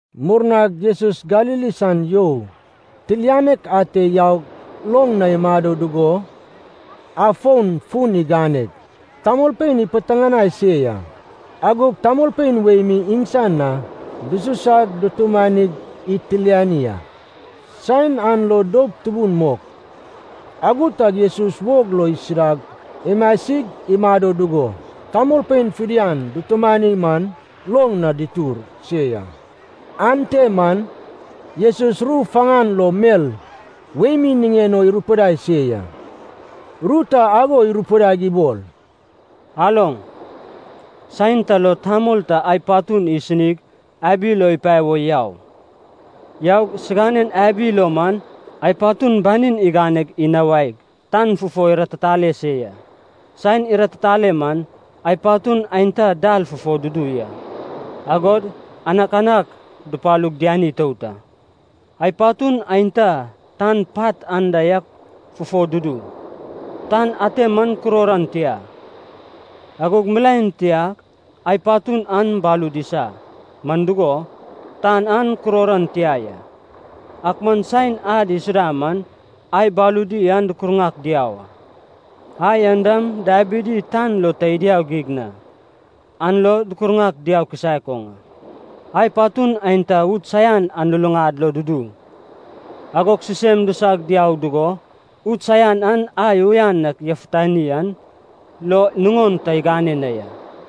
Murnag Jesus Galili san you tilianek ate yaug loŋ na imado dugo afon fun iganeg tamolpein ipiteŋanai se ya. Agog tamolpein wei mi iŋsan na dususag dutumani itilani a. Saen an lo doup tubun mok. Ago tag Jesus wog lo isudag imasig imado dugo tamolpein fidian dutumani man loŋ na ditur se ya. Ante man Jesus ru faŋan lo mel wei mi niŋen o irupidai se ya. Ru ta ago irupidaig ibol, “Aloŋ. Saen ta lo tamol ta ai patun isinig abi lo ipae wo yau. Yaug siŋanen abi lo man ai patun banin igane inawaig tan fufo iratitale se ya. Saen ratitale man, ai patun aenta dal fufo dudu ya, agog anakanak dupalug diani itout a. Ai patun aenta tan pat anda yak fufo dudu, tan ate man kuror an tia, agog milaen tiag ai patun an balud isa, man dugo, tan an kuror an tia ya. Ak man saen ad isuda man ai baludi an dukurŋak diau a. Ai an dam dabidi tan lo ta idiau geig na, an lo dukurŋak diau kisaek oŋ a. Ai patun aenta ud saian an luluŋad lo dudu, agog sisem disag diau dugo ud saian an ai uyan ak yafutani an lo nuŋon ta igane na ya.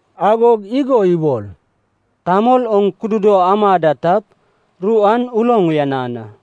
Agog igo ibol, “Tamol oŋ kududo ama da tap, ru an uloŋ uyanan a.”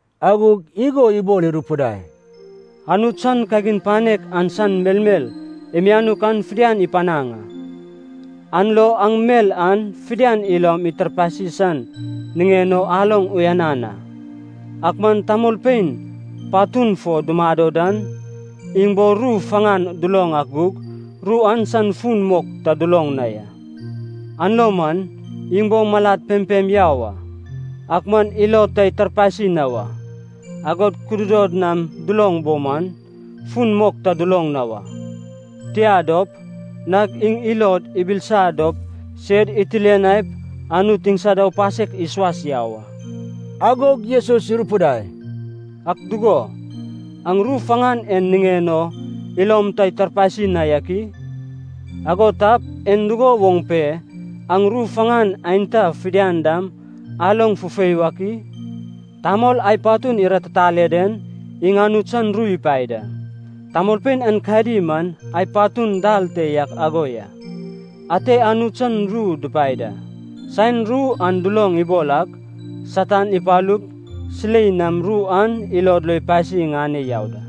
Agog igo ibol irupidai, “Anut san kagin panek an san melmel imianuk an fidian ipanaŋ a. An lo aŋ mel en fidian ilom itarpasi san niŋen o aloŋ uyanan a. Ak man tamolpein patun fo dumado dan, iŋ bo ru faŋan duloŋ ak gug, ru an san fun mok ta duloŋ na ya. An lo man, ‘Iŋ bo malad pempem yau a, ak man ilod ta itarpasi na wa, agod kududod nam duloŋ bo man, fun mok ta duloŋ na wa. Tia dop, nag iŋ ilod ibilisa dop sed itilianaip Anut iŋsad aupasek isuas yau a.’” Agog Jesus irupidai, “Ak dugo, aŋ ru faŋan en niŋen o ilom ta itarpasi na yak i? Ago tap, en dugo woŋ pe aŋ ru faŋan aenta fidian dam aloŋ fufei wak i? Tamol ai patun iratitale den, iŋ Anut san ru ipae da. Tamolpein aenkadi man ai patun dal te yak ago ya. Ate Anut san ru dipae da. Saen ru an duloŋ ibol ak, Satan ipalup silei nam ru an ilod lo ipasi iŋane yau da.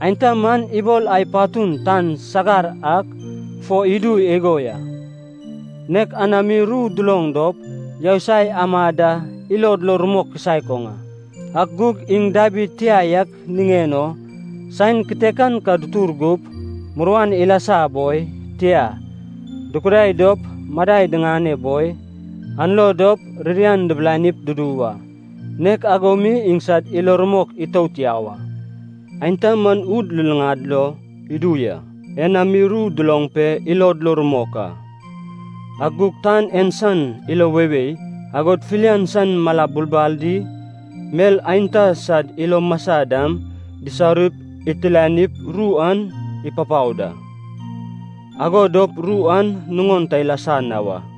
Aenta man ibol ai patun tan sagar ak fo idu igo ya, nek anami ru duloŋ dop yousai amad da ilod lo rumok kisaek oŋ a. Ak gug iŋ dabid tia yak niŋen o saen kitekan ka dutur gup, muruan ilasa boi, tia, dukudai dop madai diŋane boi, an lo dop ririan dibilanip dudu wa. Nek ago mi iŋsad ilo rumok itout yau a. Aenta man ud luluŋad lo idu ya. Enami ru duloŋ pe ilod lo rumok a. Ak gug tan en san ilo weiwei, agod filian san mala bulbal di mel aenta sad ilo masa dam, disaurip itilanip ru an ipapao da. Ago dop ru an nuŋon ta ilasa na wa.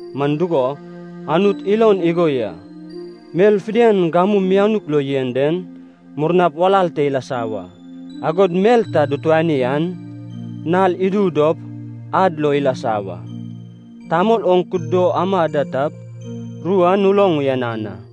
Man dugo Anut ilon igo ya, mel fidian gamu mianuk lo yen den, murnap walal te ilasa wa. Agod mel ta dutuani an, nal idu dop ad lo ilasa wa. Tamol oŋ kududo ama da tap, ru an uloŋ uyanan a.”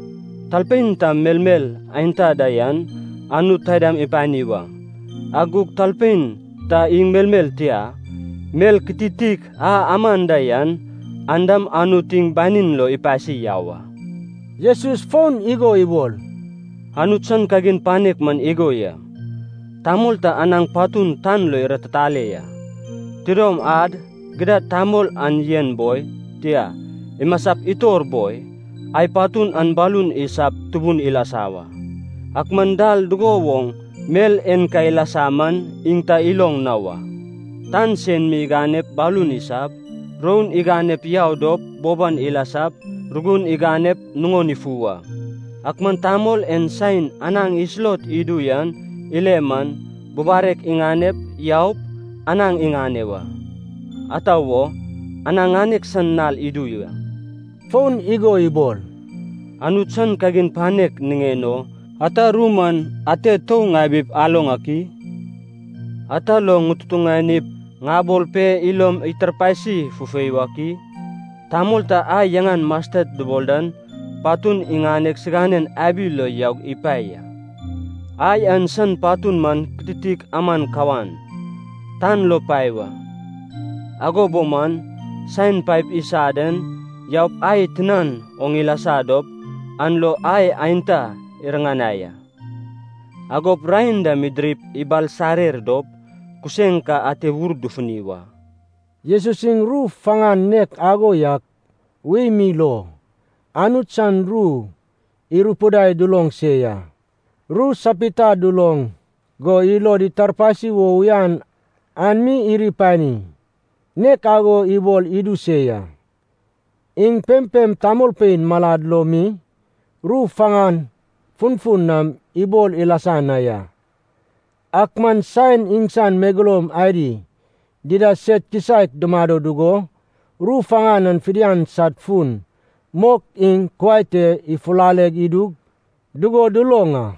Talpein ta melmel aenta da yan, Anut taidam ipani wa. Ak gug talpein ta iŋ melmel tia, mel kititik a aman da yan, an dam Anut iŋ banin lo ipasi yau a.” Jesus fon igo ibol, “Anut san kagin panek man igo ya. Tamol ta anaŋ patun tan lo iratitale ya. Tidom ad, gidad tamol an yen boi, tia, imasap itor boi, ai patun an balun isap tubun ilasa wa, ak man dal dugo woŋ mel en ka ilasa man iŋ ta iloŋ na wa. Tan sen mi iganep balun isap, roun iganep yau dop boban ilasap, rugun iganep, nuŋon ifu wa. Ak man tamol en saen anaŋ isulot idu yan ile man, bubarek iŋanep, yaup, anaŋ iŋane wa. Ata wo, anaŋ ŋanek san nal idu ya.” Fon igo ibol, “Anut san kagin panek niŋen o ata ru man ate tou ŋabip aloŋ ak i? Ata lo ŋututuŋanip ŋabol pe ilom itarpasi fufei wak i? Tamol ta ai yaŋan mastet dubol dan patun iŋaneg siganen abi lo yaug ipae ya. Ai an san patun man kititik aman kawan, tan lo pae wa. Ago bo man, saen paep isa den yaup ai tinan oŋ ilasa dop an lo ai aenta iriŋanai a, agop raen dam idirip ibalsarer dop kuseŋ ka ate wur dufuni wa.” Jesus iŋ ru faŋan nek ago yak wei mi lo Anut san ru irupidaig duloŋ se ya. Ru sapita duloŋ go ilod itarpasi wo uyan an mi iri panim, nek ago ibol idu se ya. Iŋ pempem tamolpein malad lo mi ru faŋan funfun nam ibol ilasa na ya. Ak man saen iŋsan megeloum adi dida sed kisaek dumado dugo, ru faŋan an fidian sad fun mok iŋ kuai te ifulale idu dugo duloŋ a.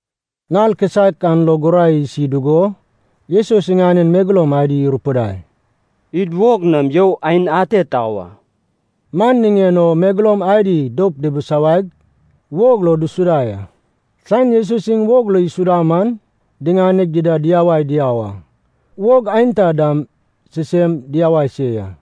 Nal kisaek an lo gurai isi dugo, Jesus iŋanen megeloum adi irupidai, “Id wog nam you aen ate tau a.” Man niŋen o megeloum adi doup dibisawaig, wog lo disuda ya. Saen Jesus iŋ wog lo isuda man diŋaneg ida diyawaig diau a. Wog aenta dam sisem diau se ya.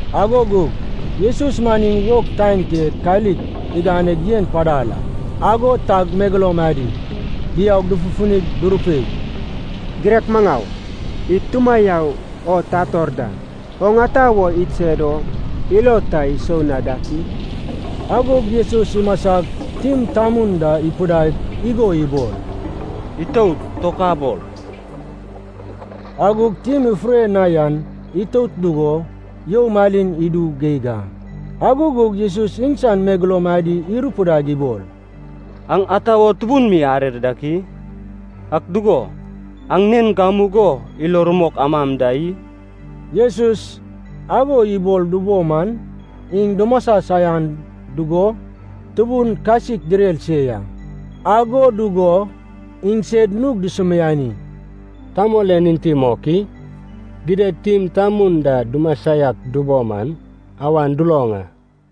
Ago gug Jesus man iŋ wog taen te kalik iganeg yen padal a. Ago tag megeloum adi diaug dufufunig durupei, “Girek maŋau, id tumayau o tator da. Oŋ ata wo idsed o ilo ta isou na dak i!” Agog Jesus imasag, tim tamun da ipidaig igo ibol, “Itout! Tokabol!” Agog tim ifure na yan itout dugo you malin idu geig a. Ago gug Jesus iŋsan megeloum adi irupidaig ibol, “Aŋ ata wo tubun mi arer dak i? Ak dugo, aŋ nen gamugo ilo rumok amam da i?” Jesus ago ibol dubo man iŋ dumasa saian dugo tubun kasik direr se ya. Ago dugo iŋsed nug dusumiani, “Tamol en enti mok i? Gidad tim tamun da dumasa yak dubo man awan duloŋ a.”